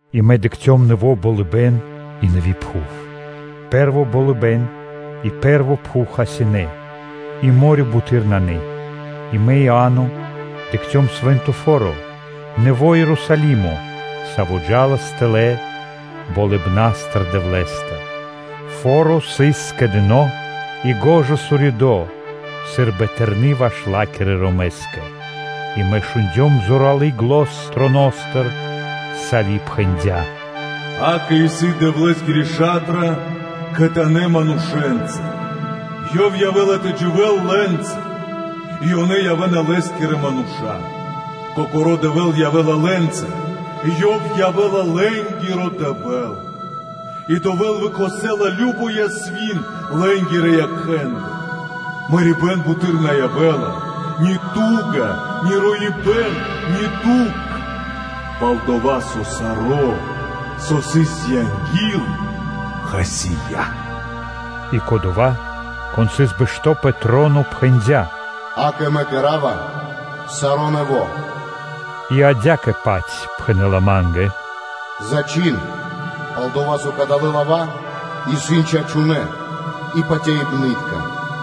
И мэ дыкхцём нэво́ болыбэ́н и нэви́ пхув. Пэ́рво болыбэ́н и пэ́рво пхув хасинэ́ и мо́рё (дэрья́в) буты́р нанэ. И мэ, Иа́но, дыкхцём Свэ́нто Фо́ро, нэво́ Ерусалимо, саво́ джа́лас тэлэ́ Дэвлэ́стыр болыбна́стыр. Фо́ро сыс скэдыно́ и шукар уридо́ сы́рбы тэрны́ ваш ла́кирэ ромэ́скэ. И мэ шундём зоралы́ зан троностыр, со пхэндя́: “Акэ, исын Дэвлэ́скири ша́тра кхэтанэ́ манушэ́нца! Ёв явэ́ла тэ дживэ́л лэ́нца, и ёнэ явэ́на Лэ́скирэ мануша́. Кокоро́ Дэвэ́л явэ́ла лэ́нца и Ёв явэ́ла лэ́нгиро Дэвэ́л. И Дэвэ́л выкхосэла кажно ясвин лэ́нгирэ якхэ́ндыр. Мэрибэ́н буты́р на явэ́ла, ни ту́га, ни роибэ́н, ни дукх. Пал-дова́ со саро́, со сыс анги́л, хасия́.” И, Кодова́, Кон сыс бэшто́ пэ троно, пхэндя́: “Акэ, мэ кэра́ва саро́ нэво́.” И адя́кэ-паць пхэнэ́ла ма́нгэ: “Зачхин, пал-дова́ со кадалэ́ лава́ исын чачунэ́ и патяибнытка.”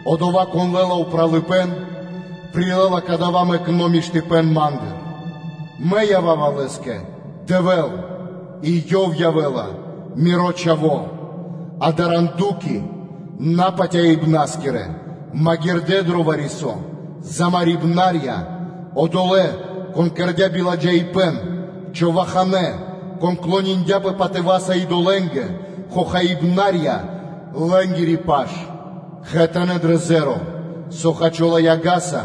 Одова́, кон лэ́ла упралыпэ́н, прилэ́ла дава́ мэкно́ миштыпэ́н Ма́ндыр: Мэ ява́ва лэ́скэ Дэвэ́л, и ёв явэ́ла Миро Чхаво́. А даранду́ки, напатяибна́скирэ, магирдэ́ дро вари-со, замарибна́рья; одолэ́, кон кэрдя́ биладжаипэ́н, човаханэ́, кон клониндяпэ патыва́са (кэрдэ шэрэ́са) идолэ́нгэ, хохаибна́рья-лэ́нгири паш явэ́ла кхэтанэ́ дро зеро (озеро), со хачола яга́са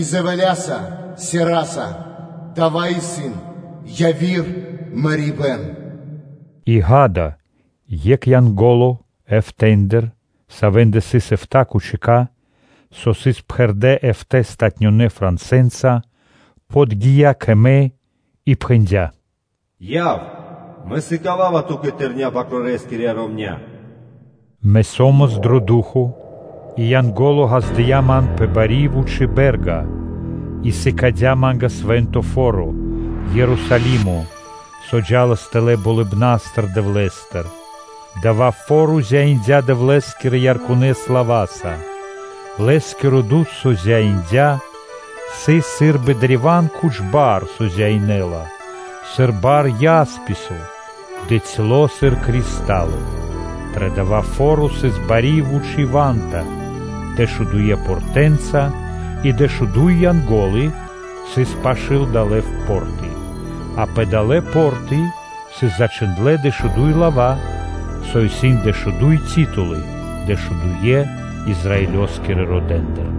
и дзэвэля́са (сераса); дава́ исын-яви́р мэрибэ́н.” И ґа́да, екх эфта́ (эфтэ) Янголэ́ндыр, савэ́ндэ сыс эфта́ тахтая́ (чашы), со сыс пхэрдэ́ эфта́ палатунэ́ франсэ́нца, подги́я кэ, мэ и пхэндя́: “Яв! Мэ сыкава́ва ту́кэ тэрня́ Свэнтонэ́-Бакрорэ́скирья ромня́!” Мэ со́мас дро ду́хо (фа́но) и Янго́ло ґаздыя́ ман пэ бари и вучи́ бэ́рга и сыкадя́ ма́нгэ свэ́нто фо́ро, Ерусалимо, со джа́лас тэлэ́ болыбна́стыр, Дэвлэ́стыр. Дава́ фо́ро зяиндя Дэвлэ́скирэ ярконэ́ слава́са. Лэ́скиро дуд, саво зяиндя, сыс сы́рбы древа́н куч бар, со зяинэла, сыр бар ясписо, дыцьло сыр кристало. Дро дава́ фо́ро сыс бари и вучи́ ва́нта дэшудуе́ портэнца (вратэнца) и дэшуду́й Янго́лы сыс пашы́л далэ́ по́рты, а пэ далэ́ по́рты сыс зачхиндлэ́ дэшуду́й лава́, со исын дэшуду́й ти́тулы-дэшудуе́ Израилёскирэ родэ́ндыр.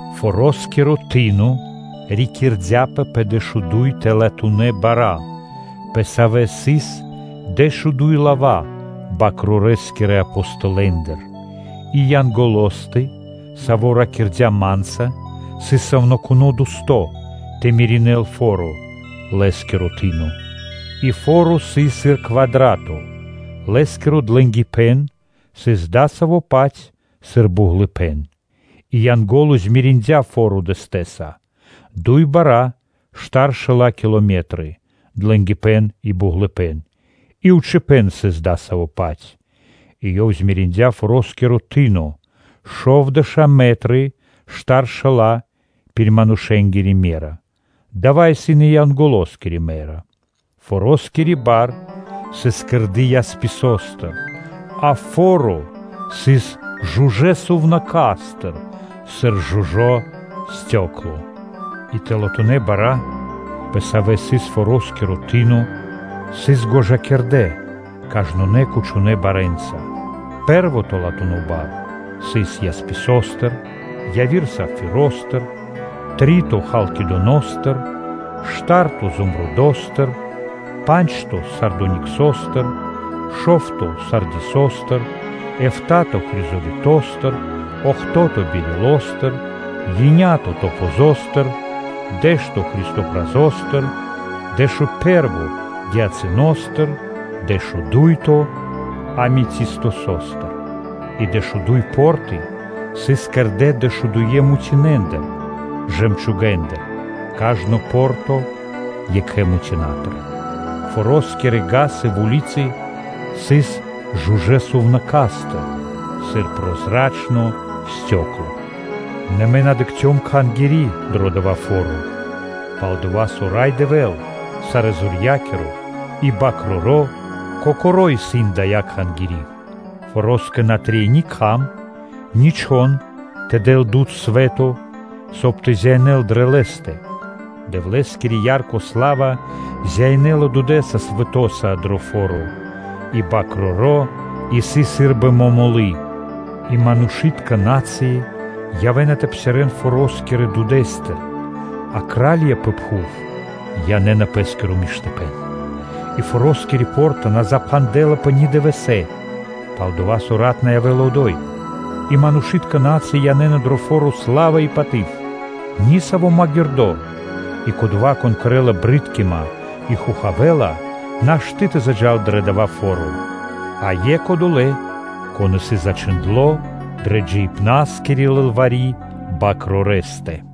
Форо́скиро ты́но рикирдяпэ пэ дэшуду́й тэлатунэ́ бара́, пэ савэ́ сыс дэшуду́й лава́ Свэнтонэ́-Бакрорэ́скирэ Апостолэ́ндыр. И Янголостэ, саво́ ракирдя́ ма́нца, сыс сувнакуно́ дэсто́ тэ меринэл фо́ро, по́рта (вра́ты), лэ́скиро тыно (ва́нта). И фо́ро сыс сыр квадрато: лэ́скиро длэнгипэ́н сыс дасаво-паць сыр буґлыпэ́н. И Янго́ло змериндя фо́ро дэстэса: дуй бара́ штар шэла́ километры (вэрсты), длэнгипэ́н, и буґлыпэ́н, и вучипэ́н исын дасавэ́-паць. И ёв мериндя форо́скири бар: шовдэша́ мэтры штар шэла́ пир манушэ́нгири ме́ра, дава́ исын и Янголоскири ме́ра. Фороскири ва́нта (бар) сыс кэрды ясписостыр, а фо́ро сыс жужэ́ сувнака́стыр сыр жужо́ стёкло (балу́н). И тэлатунэ́ бара́, пэ савэ́ сыс форо́скири ва́нта, сыс гожакирдэ кажнонэ́ куч барэ́нца: пэ́рво тэлатуно бар сыс ясписостыр, яви́р – сапфиростыр, три́то – халкидоностыр, шта́рто – зумрудостыр; па́нджто – сардониксостыр, шо́вто – сардисостыр, эфта́то-хризолитостыр, охто́то – бирилостыр, еня́то – топазостыр, дэ́што – христопразостыр, дэшупэрво – гиацынтостыр, дэшудуйто – аметистостыр. И дэшуду́й по́рты сыс кэрдэ́ дэшудуе́ мутинэ́ндыр (жэмчугэндыр), кажно по́рта екхэ мутинатыр. Форо́скирэ вули́цы (га́сы) сыс жужэ́ сувнака́стыр сыр прозрачно стёкло (балун). Нэ мэ на дыкхцём Кхангири́ дро дава́ фо́ро, пал-дова́, со Рай Дэвэ́л, Сарэзорья́киро, и Свэ́нто Бакроро́ Кокоро́ исын дая́ Кхангири́. Фороскэ на трэй ни кхам, ни чхон тэ дэл дуд (свэ́то), соб (кай) тэ зяинэл дро лэ́стэ. Дэвлэ́скири ярко сла́ва зяинэла дудэ́са дро фо́ро и Бакроро́ исын сы́рбы момолы́тко (свети́льнико). И манушы́тка народы явэ́на тэ псирэ́н форо́скирэ дудэ́стыр, а кра́лья пэ пхув янэ́на пэ́скиро миштыпэ́н. И форо́скири по́рта на запхандэ́лапэ ни дывэсэ́, пал-дова́ со рат на явэ́ла одо́й. И манушы́тка расы (народы) янэ́на дро фо́ро сла́ва и паты́в. Ни саво́ магирдо́, и кодова́, кон кэрэ́ла джунгалыпэ́н (брыткима) и хохавэла нашты́ тэ заджа́л дро дава́ фо́ро, а екх одова́, кон исын зачхиндло́ дрэ джиибна́скири лылвари́ Бакрорэстэ.